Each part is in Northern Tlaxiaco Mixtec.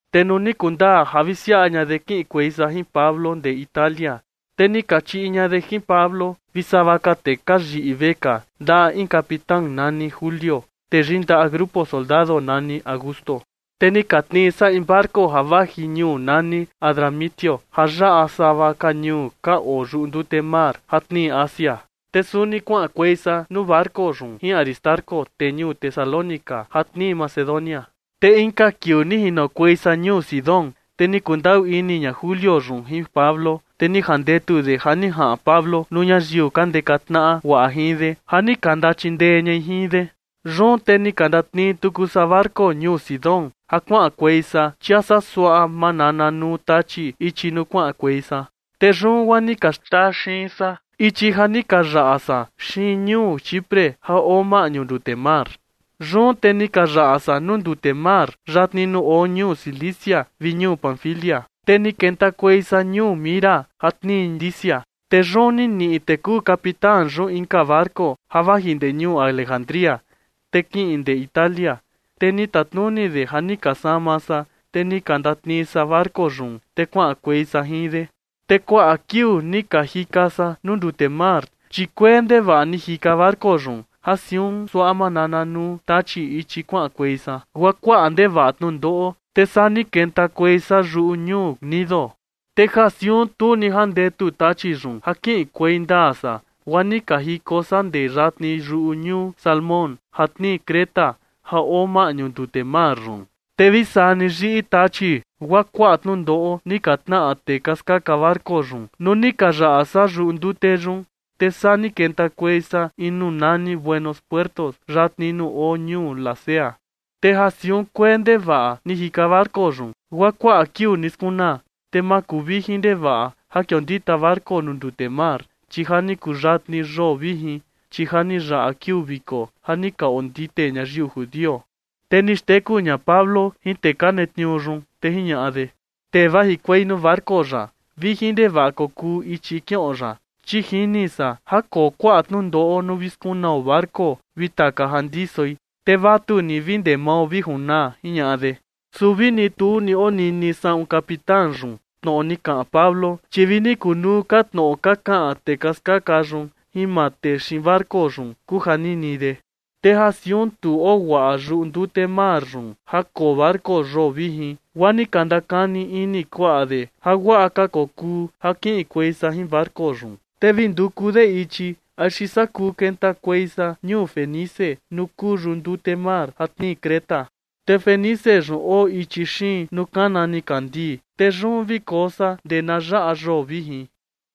Te nuu ni kundaa ja vi siaꞌa ña de kiꞌinkuei san jin Pablo ndee Italia. Te ni ka chiꞌi ña de jin Pablo vi sava ka tee ka yiꞌi vekaa ndaꞌa in capitán nani Julio, tee yindaꞌa grupo soldado nani Augusto. Te ni ka tnii san in barco ja vaji ñuu nani Adramitio ja yaꞌa sava ka ñuu ka oo yuꞌu ndute mar ja tnii Asia. Te suni kuaꞌankuei san nuu barco yun jin Aristarco, tee ñuu Tesalónica ja tnii Macedonia. Te inka kiuu ni jinokuei san ñuu Sidón, te ni kundaꞌu ini ña Julio yun jin Pablo, te ni jandetu de ja ni jaꞌan Pablo nuu ñayiu ka ndeka tnaꞌa guaꞌa jin de ja ni ka ndachindee ñai jin de. Yun te ni ka ndatnii tuku san barco ñuu Sidón ja kuaꞌankuei san chia saa suaꞌa manana nuu tachi ichi nuu kuaꞌankuei san. Te yun guaa ni ka xtaa xiin san ichi ja ni ka yaꞌa san xiin ñuu Chipre ja oo maꞌñu ndute mar. Yun te ni ka yaꞌa san nuu ndute mar yatni nuu oo ñuu Cilicia vi ñuu Panfilia, te ni kentakuei san ñuu Mira ja tnii Licia. Te yun ni niꞌi tee kuu capitán yun inka barco ja vaji ndee ñuu Alejandría, te kiꞌin ndee Italia. Te ni tatnuni de ja ni ka sama san, te ni ka ndatnii san barco yun, te kuaꞌankuei san jin de. Te kuaꞌa kiuu ni ka jika san nuu ndute mar, chi kuee ndevaꞌa ni jika barco yun ja siun suaꞌa mananuu tachi ichi kuaꞌankuei san, guaa kuaꞌa ndevaꞌa tnundoꞌo, te saa ni kentakuei san yuꞌu ñuu Gnido. Te ja siun tu ni jandetu tachi yun ja kiꞌinkuei ndaa san guaa ni ka jiko san ndee yatni yuꞌu ñuu Salmón ja tnii Creta ja oo maꞌñu ndute mar yun. Te vi saa ni yiꞌi tachi guaa kuaꞌa tnundoꞌo ni ka tnaꞌa tee ka skaka barco yun nuu ni ka yaꞌa san yuꞌu ndute yun, te saa ni kentakuei san in nuu nani Buenos Puertos yatni nuu oo ñuu Lasea. Te ja siun kuee ndevaꞌa ni jika barco yun, guaa kuaꞌa kiuu ni skunaa, te makuvijin ndevaꞌa ja kiondita barco nuu ndute mar, chi ja ni kuyatni yoo vijin, chi ja ni yaꞌa kiuu viko ja ni ka ondite ñayiu judio. Te ni xteku ña Pablo jin tee ka netniuu yun, te jiñaꞌa de: ―Tee vajikuei nuu barco yaꞌa, vijin ndevaꞌa kokuu ichi kiꞌon yaꞌa, chi jini san ja koo kuaꞌa tnundoꞌo nuu vi skunao barco vi taka ja ndisoi, te vatuni vi ndee mao vi junaa ―jiñaꞌa de. Su vini tu ni onini saꞌun capitán yun tnoꞌo ni kaꞌan Pablo, chi vi ni kunuu ka tnoꞌo ka kaꞌan tee ka skaka yun jin maa tee xiin barco yun kuu ja nini de. Te ja siun tu oo guaꞌa yuꞌu ndute mar yun ja koo barco yoo vijin, guaa ni ka ndakani ini kuaꞌa de ja guaꞌa ka kokuu ja kiꞌinkuei san jin barco yun, te vi nduku de ichi axi saa kuu kentakuei san ñuu Fenice nuu kuu yuꞌu ndute mar ja tnii Creta. Te Fenice yun oo ichi xiin nuu kana nikandii, te yun vi koo san ndee na yaꞌa yoo vijin.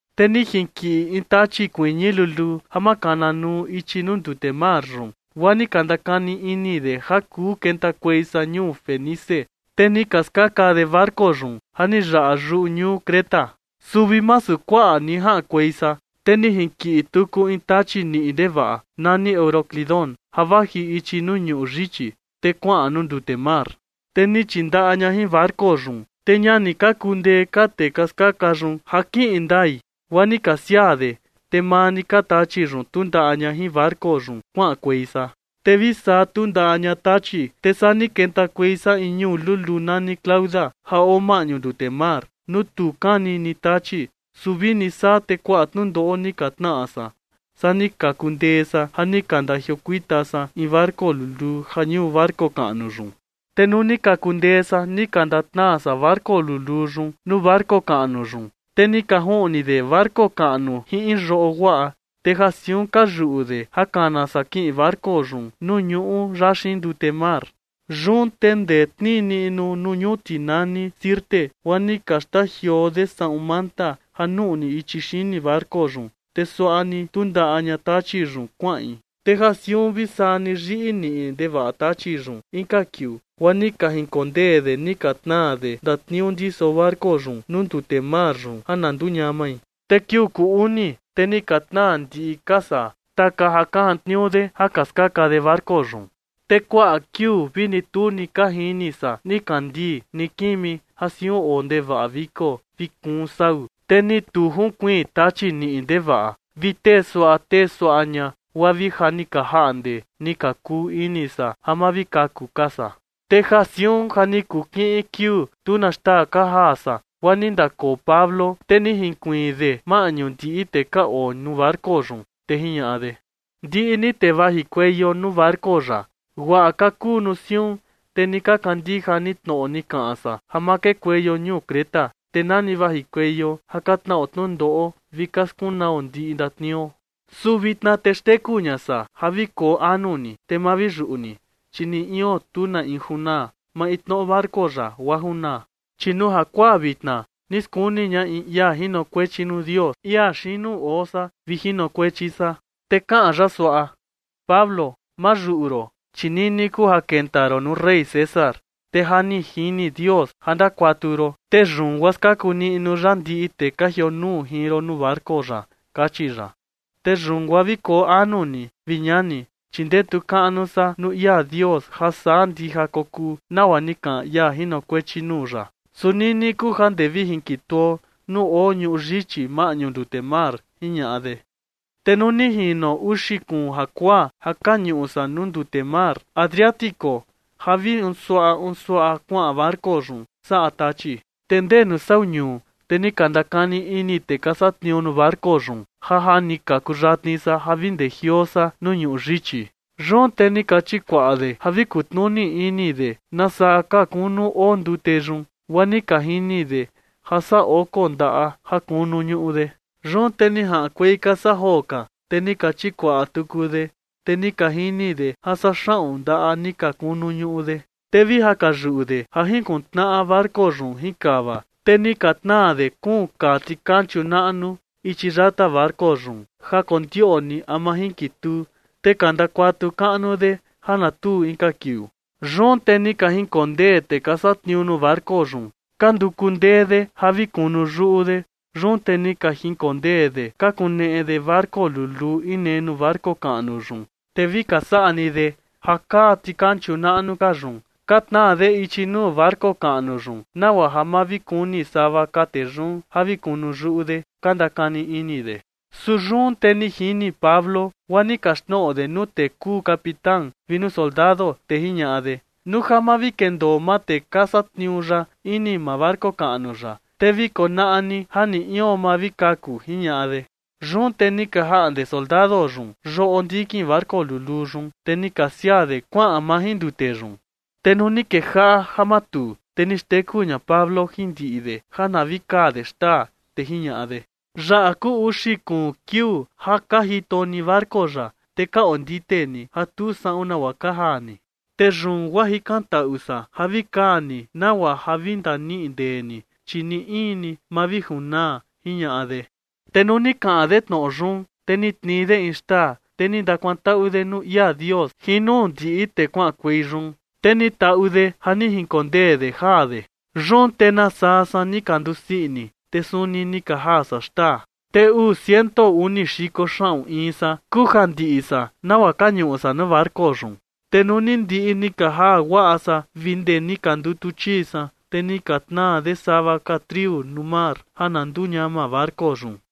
Te ni jinkiꞌi in tachi kuiñi luluu ja makana nuu ichi nuu ndute mar yun, guaa ni ka ndakani ini de ja kuu kentakuei san ñuu Fenice, te ni ka skaka de barco yun ja ni yaꞌa yuꞌu ñuu Creta. Su vi masu kuaꞌa ni jaꞌankuei san, te ni jinkiꞌi tuku in tachi niꞌi ndevaꞌa nani Euroclidón ja vaji ichi nuu ñuꞌu yichi, te kuaꞌan nuu ndute mar. Te ni chindaꞌa ña jin barco yun, te ña ni ka kundee ka tee ka skaka yun ja kiꞌin ndai, guaa ni ka siaa de, te maa ni ka tachi yun tundaꞌa ña jin barco yun kuaꞌankuei san. Te vi saa tundaꞌa ña tachi, te saa ni kentakuei san in ñuu luluu nani Clauda ja oo maꞌñu ndute mar, nuu tu kani niꞌi tachi, su vini saa te kuaꞌa tnundoꞌo ni ka tnaꞌa san. Saa ni ka kundee san ja ni ka ndajiokuita san in barco luluu ja ñuu barco kaꞌnu yun. Te nuu ni ka kundee san ni ka ndatnaa san barco luluu yun nuu barco kaꞌnu yun. Te ni ka juꞌni de barco kaꞌnu jin in yoꞌo guaꞌa, te ja siun ka yuꞌu de ja kana saa kiꞌin barco yun nuu ñuꞌu yaxin ndute mar. Yun te ndee tnii niꞌnu nuu ñuti nani Sirte, guaa ni ka xtajioo de saꞌun manta ja nuꞌni ichi xini barco yun. Te suaꞌa ni tundaꞌa ña tachi yun kuaꞌin. Te ja siun vi saa ni yiꞌi niꞌi ndevaꞌa tachi yun inka kiuu, guaa ni ka jinkondee de ni ka tnaa de ndatniuu ndiso barco yun nuu ndute mar yun ja na nduu ñamai. Te kiuu kuu uni, te ni ka tnaa ndiꞌi ka san taka ja ka jantniuu de ja ka skaka de barco yun. Te kuaꞌa kiuu vini tu ni ka jini san nikandii ni kimi ja siun oo ndevaꞌa viko vi kuun sau, te ni tu jinkuiin tachi niꞌi ndevaꞌa vi tee suaꞌa tee suaꞌa ña guaa vi ja ni ka jaꞌnde ni ka kuu ini san ja ma vi kaku ka san. Te ja siun ja ni kuu kiꞌin kiuu tu na xtaa ka jaa san, guaa ni ndakoo Pablo, te ni jinkuiin de maꞌñu ndiꞌi tee ka oo nuu barco yun, te jiñaꞌa de: ―Ndiꞌi ni tee vajikueio nuu barco yaꞌa, guaꞌa ka kuu nuu siun te ni ka kandija ni tnoꞌo ni kaꞌan san ja ma kekueio ñuu Creta, te nani vajikueio ja ka tnaꞌo tnundoꞌo vi ka skunao ndiꞌi ndatniuu. Su vitna te xteku ña san ja vi koo anu ni, te ma vi yuꞌu ni, chi ni ion tu na in junaa, maintnoꞌo barco yaꞌa guaa junaa. Chi nuu jakuaa vitna, ni skuni ña in ia jinokuechi nuu Dios, ia xiin nuu oo san vi jinokuechi san. Te kaꞌan ya suaꞌa: “Pablo, ma yuꞌu ron, chi nini kuu ja kenta ron nuu rey César. Te ja ni jini Dios ja ndakuatu ron, te yun guaa skaku niꞌnu ya ndiꞌi tee ka jionuu jin ron nuu barco yaꞌa”, kachi ya. Te yun guaa vi koo anu ni, vi ñani, chi ndetu kaꞌnu san nuu ia Dios ja saa ndija kokuu nagua ni kaꞌan ia jinokuechi nuu ya. Su nini kuu ja ndee vi jinkituo nuu oo ñuꞌu yichi maꞌñu ndute mar ―jiñaꞌa de. Te nuu ni jino uxi kuun jakuaa ja ka ñuꞌu san nuu ndute mar Adriático ja vi unsuaꞌa unsuaꞌa kuaꞌan barco yun saꞌa tachi, te ndee nuu sau ñuu, te ni ka ndakani ini tee ka satniuu nuu barco yun ja ja ni ka kuyatni san ja vi ndejioo san nuu ñuꞌu yichi. Yun te ni ka chikuaꞌa de ja vi kutnuni ini de nasaa ka kunu oo ndute yun, guaa ni ka jini de ja saa oko ndaꞌa ja kunu ñuꞌu de. Yun te ni jaꞌankuei ka san joo ka, te ni ka chikuaꞌa tuku de, te ni ka jini de ja saa xaꞌun ndaꞌa ni ka kunu ñuꞌu de. Te vi ja ka yuꞌu de ja jinkuntnaꞌa barco yun jin kava, te ni ka tnaa de kuun kaa tikanchu naꞌnu ichi yata barco yun ja kondioꞌni a ma jinkituu, te ka ndakuatu kaꞌnu de ja na tuu inka kiuu. Yun te ni ka jinkondee tee ka satniuu nuu barco yun ka nduku ndee de ja vi kunu yuꞌu de. Yun te ni ka jinkondee de ka nuneꞌe de barco luluu inee nuu barco kaꞌnu yun, te vi ka saꞌa ni de ja kaa tikanchu naꞌnu ka yun ka tnaa de ichi nuu barco kaꞌnu yun nagua ja ma vi kuni sava ka tee yun ja vi kunu yuꞌu de, ka ndakani ini de. Su yun te ni jini Pablo, guaa ni kaxtnoꞌo de nuu tee kuu capitán vi nuu soldado, te jiñaꞌa de: ―Nuu ja ma vi kendoo maa tee ka satniuu yaꞌa ini maa barco kaꞌnu yaꞌa, te vi konaꞌa ni ja ni ion ma vi kaku ―jiñaꞌa de. Yun te ni ka jaꞌnde soldado yun yoꞌo ndikin barco luluu yun, te ni ka siaa de, kuaꞌan maa jin ndute yun. Te nuu ni kejaꞌa ja matuu, te ni xteku ña Pablo jin ndiꞌi de ja na vi kaa de xtaa, te jiñaꞌa de: ―Yaꞌa kuu uxi kuun kiuu ja ka jito ni barco yaꞌa, te ka ondite ni ja tu saꞌun nagua ka jaa ni. Te yun guaa jikantaꞌu san ja vi kaa ni nagua ja vi ndaniꞌi ndee ni, chi ni in ni ma vi junaa ―jiñaꞌa de. Te nuu ni kaꞌan de tnoꞌo yun, te ni tnii de in xtaa, te ni ndakuantaꞌu de nuu ia Dios jin nuu ndiꞌi tee kuaꞌankuei yun, te ni taꞌu de ja ni jinkondee de jaa de. Yun te nasaa san ni ka ndusii ini, te suni ni ka jaa san xtaa. Te uu ciento uni xiko xaꞌun in san kuu ja ndiꞌi san nagua ka ñuꞌu san nuu barco yun. Te nuu ni ndiꞌi ni ka jaa guaꞌa san vi ndee ni ka ndutu chii san, te ni ka tnaa de sava ka triu nuu mar ja na nduu ñama barco yun.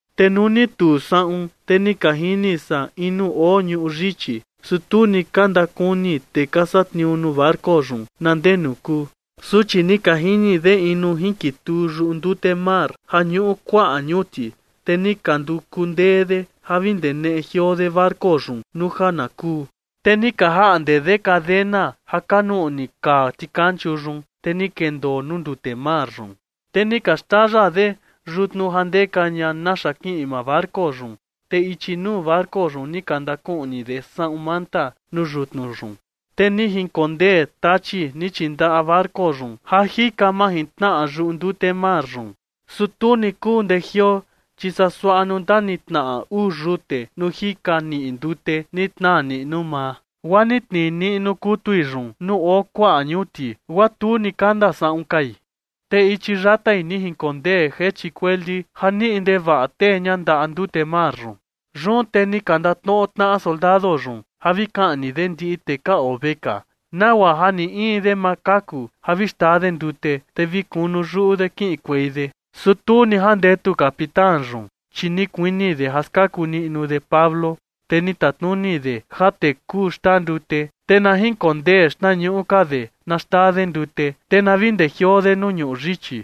Te nuu ni tuu saꞌun, te ni ka jini san in nuu oo ñuꞌu yichi, su tu ni ka ndakuni tee ka satniuu nuu barco yun na ndenu kuu. Su chi ni ka jini de in nuu jinkituu yuꞌu ndute mar ja ñuꞌu kuaꞌa ñuti, te ni ka nduku ndee de ja vi ndeneꞌe jioo de barco yun nuu ja na kuu. Te ni ka jaꞌnde de cadena ja ka nuꞌni kaa tikanchu yun, te ni kendoo nuu ndute mar yun. Te ni ka xtaya de yutnu ja ndeka ña naxa kiꞌin maa barco yun. Te ichi nuu barco yun ni ka ndakuꞌni de saꞌun manta nuu yutnu yun. Te ni jinkondee tachi ni chindaꞌa barco yun ja jika majintnaꞌa yuꞌu ndute mar yun. Su tu ni kuu ndejioo, chi saa suaꞌa nuu ndanitnaꞌa uu yute nuu jika niꞌi ndute ni tnaa niꞌnu maa, guaa ni tnii niꞌnu kutui yun nuu oo kuaꞌa ñuti, guaa tu ni kandaa saꞌun kai. Te ichi yatai ni jinkondee jechi kueli ja niꞌi ndevaꞌa tee ña ndaꞌa ndute mar yun. Yun te ni ka ndatnoꞌo tnaꞌa soldado yun ja vi kaꞌni de ndiꞌi tee ka oo vekaa, nagua ja ni in de ma kaku ja vi xtaa de ndute, te vi kunu yuꞌu de kiꞌinkuei de. Su tu ni jandetu capitán yun, chi ni kuini de ja skaku niꞌnu de Pablo. Te ni tatnuni de ja tee kuu xtaa ndute, te na jinkondee xtnañuꞌu ka de na xtaa de ndute, te na vi ndejioo de nuu ñuꞌu yichi.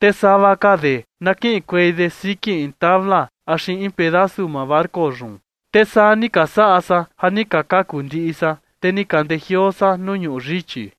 Te sava ka de na kiꞌinkuei de siki in tabla axi in pedasu maa barco yun. Te saa ni ka saꞌa san ja ni ka kaku ndiꞌi san, te ni ka ndejioo san nuu ñuꞌu yichi.